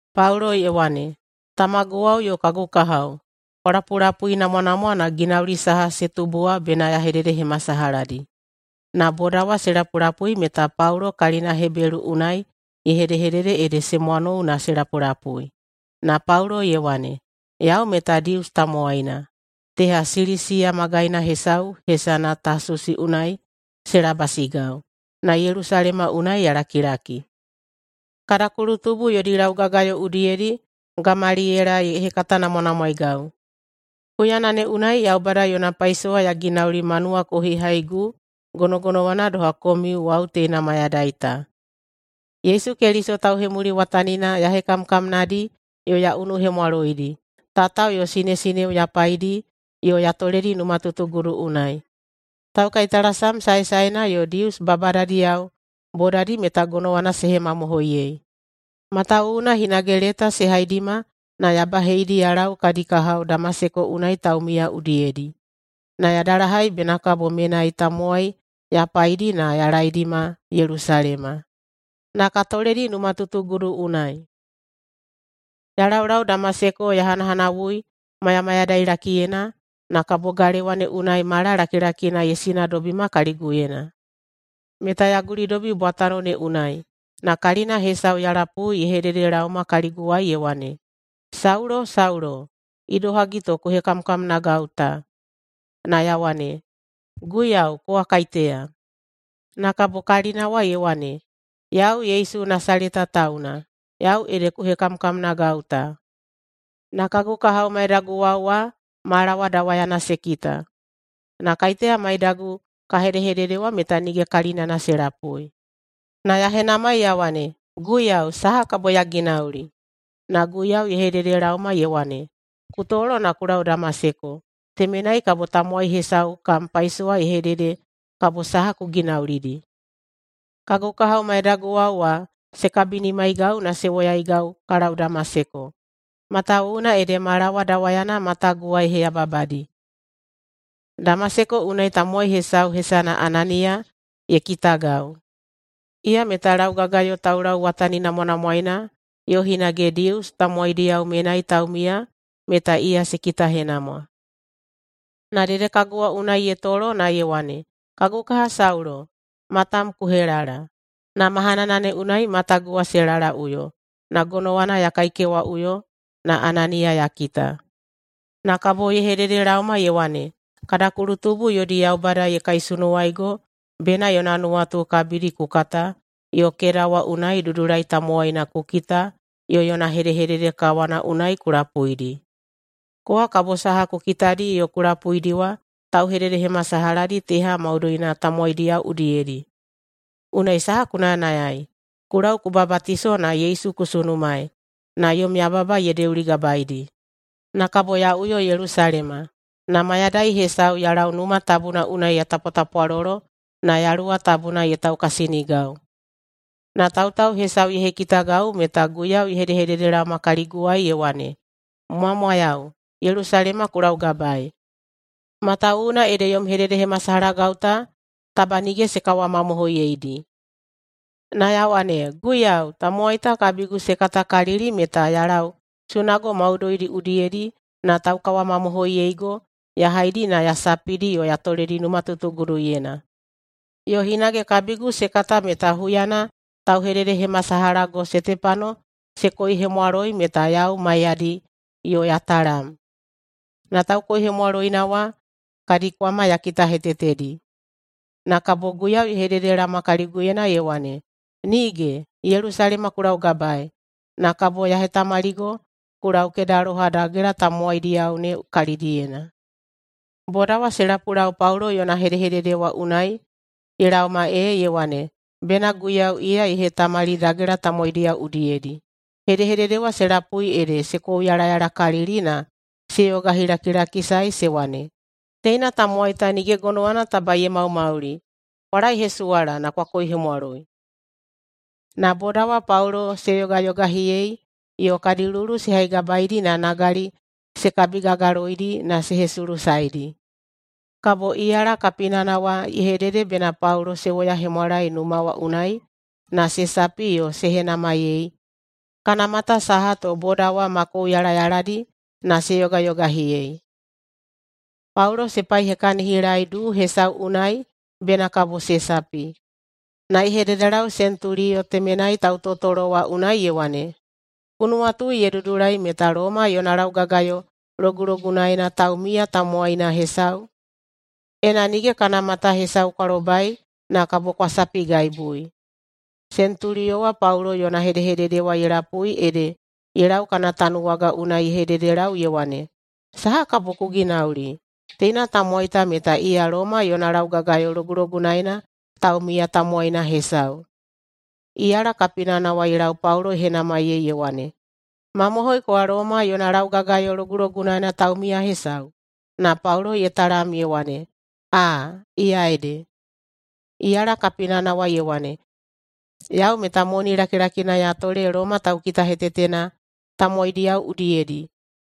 Paulo ye wane, “Tamaguwao yo kagu kahao, kwa lapulapuinamwanamwa na ginauli saha se tubu wa bena ya hededehemasalahadi.” Na boda wa se lapulapui meta Paulo kalina Hebelu unai ye hedehedede ede se mwanou na se lapulapui. Na Paulo ye wane, “Yau meta Dius tamowaina, teha Silisiya magaina hesau hesana Tasusi unai se labasigau, na Yelusalema unai ya lakilaki. Kada kulutubu yodi laugagayo udiyedi Gamaliyela ye hekatanamwanamwaegau. Huyana ne unai Yaubada yona paisowa ya ginauli ma nuwakohihaigu gonogonowana doha komiu wau teina mayadai ta. Yesu Keliso tauhemuliwatanina ya hekamkamnadi yo ya unuhemwaloidi. Tatao yo sinesineo ya paidi yo ya toledi numatutugudu unai. Taukaitalasam saesaena yo Dius babadadiyao bodadi meta gonowana se hemamohoiyei, matawuwuna hinage leta se haidima na ya baheidi ya lau kadi kahao Damaseko unai taumiya udiyedi, na ya dalahai bena kabo menai tamowai ya paidi na ya laedima Yelusalema, na ka toledi numatutugudu unai. Ya laulau Damaseko ya hanahanawui mayamayadailakiyena, na kabo galewa ne unai mala lakilakina ye sinadobima kaliguyena. Meta ya gulidobi bwatano ne unai, na kalina hesau ya lapui ye hedehededelaoma kaliguwai ye wane, ‘Saulo! Saulo! Idohagi to ku hekamkamnagau ta.’ Na ya wane, ‘Guiyau, kowa kaiteya?’ Na kabo kalina wa ye wane, ‘Yau Yesu Nasaleta tauna, yau ede ku hekamkamnagau ta.’ Na kagu kahao maidaguwao wa mala wa dawayana se kita, na kaiteya maidagu ka hedehedede wa meta nige kalinana se lapui. Na ya henamai ya wane, ‘Guiyau, saha kabo ya ginauli?’ Na Guiyau ye hededelaoma ye wane, ‘Ku tolo na ku lau Damaseko. Temenai kabo tamowai hesau kam paisowa ye hedede kabo saha ku ginaulidi.’ Kagu kahao maidaguwao wa se kabinimaigau na se woyaigau ka lau Damaseko. Matawuwuna ede mala wa dawayana matagu wa ye heyababadi. Damaseko unai tamowai hesau hesana Ananiya ye kitagau. Iya meta laugagayo taulauwataninamwanamwaena yo hinage Dius tamowaidiyao menai taumiya meta iya se kitahenamwa. Na dedekagu wa unai ye tolo na ye wane, ‘Kagu kaha Saulo, matam ku helala!’ Na mahanana ne unai matagu wa se lalaꞌuyo, na gonowana ya kaikewaꞌuyo na Ananiya ya kita. Na kabo ye hededelaoma ye wane, ‘Kada kulutubu yodi Yaubada ye kaisunuwaigo bena yona nuwatu kabidi ku kata yo [keda wa unai] Dudulai Tamowaina ku kita yo yona hedehedede kawana unai ku lapuidi. Kowa kabo saha ku kitadi yo ku lapuidi wa tauhededehemasalahadi teha maudoina tamowaidiyao udiyedi. Unai saha ku nayanayai, ku lau ku babatiso na Yesu ku sunumaei na yom yababa ye deuligabaedi.’ Na kabo ya uyo Yelusalema, na mayadai hesau ya lau Numa Tabuna unai ya tapwatapwalolo na Yaluwa Tabuna ye taukasinigau, na tautau hesau ye hekitagau meta Guiyau ye hedehededelaoma kaliguwai ye wane, ‘Mwamwayau, Yelusalema ku laugabaei, matawuwuna ede yom hededehemasalahagau ta taba nige se kawamamohoiyeidi.’ Na ya wane, ‘Guiyau, tamowai ta kabigu se katakalili meta ya lau sunago maudoidi udiyedi na taukawamamohoiyeigo ya haidi ya sapidi yo ya toledi numatutuguduyena. Yo hinage kabigu se kata meta huyana tauhededehemasalahago Setepano se koihemwaloi meta yau maiyadi yo ya talam, na taukoihemwaloina wa kadi kwama ya kitahetetedi.’ Na kabo Guiyau ye hededelaoma kaliguyena ye wane, ‘Nige! Yelusalema ku laugabaei, na kabo ya hetamaligo ku lau kedaloha dagela tamowaidiyao ne kalidiyena.’” Boda wa se lapulau Paulo yona hedehedede wa unai ye laoma ee ye wane bena Guiyau iya ye hetamali dagela tamowaidiyao udiyedi. Hedehedede wa se lapui ede se kouyalayalakalili na se yogahilakilakisae se wane, “Teina tamowai ta nige gonowana taba ye maumauli! Kwa laehesuwala na kwa koihemwaloi!” Na boda wa Paulo se yogayogahiyei yo kadi luwuluwu se haigabaedi na nagali se kabigagaloidi na se hesulusaedi. Kabo iyala kapinana wa ye hedede bena Paulo se woyahemwalae numa wa unai na se sapi yo se henamaiyei kana mata saha to boda wa ma kouyalayaladi na se yogayogahiyei. Paulo se paihekahinilaei duu hesau unai bena kabo se sapi, na ye hededelau sentuliyo temenai tautotolo wa unai ye wane, “Ku nuwatui ye dudulai meta Loma yona laugagayo logulogunaena taumiya tamowaina hesau, ena nige kana mata hesau kwa lobai, na kabo kwa sapigaibui?” Sentuliyo wa Paulo yona hedehedede wa ye lapui ede ye lau kana tanuwaga unai ye hededelau ye wane, “Saha kabo ku ginauli? Teina tamowai ta meta iya Loma yona laugagayo logulogunaena taumiya tamowaina hesau.” Iyala kapinana wa ye lau Paulo ye henamaiyei ye wane, “Mamohoi kowa Loma yona laugagayo logulogunaena taumiya hesau?” Na Paulo ye talam ye wane, “Aa, iya ede.” Iyala kapinana wa ye wane, “Yau meta moni lakilakina ya tole Loma taukitahetetena tamowaidiyao udiyedi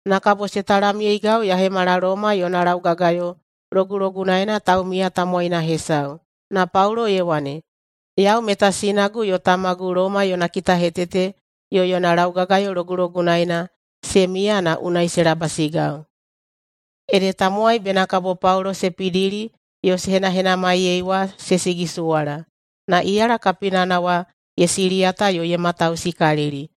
na kabo se talamyeigau ya hemala Loma yona laugagayo logulogunaena taumiya tamowaina hesau.” Na Paulo ye wane, “Yau meta sinagu yo tamagu Loma yona kitahetete yo yona laugagayo logulogunaena se miya na unai se labasigau.” Ede tamowai bena kabo Paulo se pidili yo se henahenamaiyei wa se sigisuwala. Na iyala kapinana wa ye siliyata yo ye matausikalili,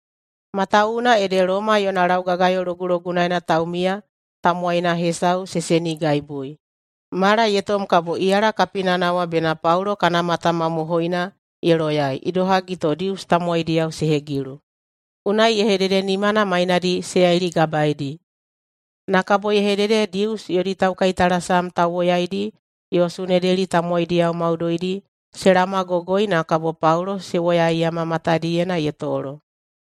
matawuwuna ede Loma yona laugagayo logulogunaena taumiya tamowaina hesau ye senigaibui. Mala ye tom kabo iyala kapinana wa bena Paulo kana mata mamohoina ye loyai, idohagi to Dius tamowaidiyao se hegilu. Unai ye hedede nimana mainadi se yailigabaedi, na kabo ye hedede Dius yodi taukaitalasam tauwoyaidi yo Sunedeli tamowaidiyao maudoidi se laomagogoi na kabo Paulo se woyaiyama matadiyena ye tolo.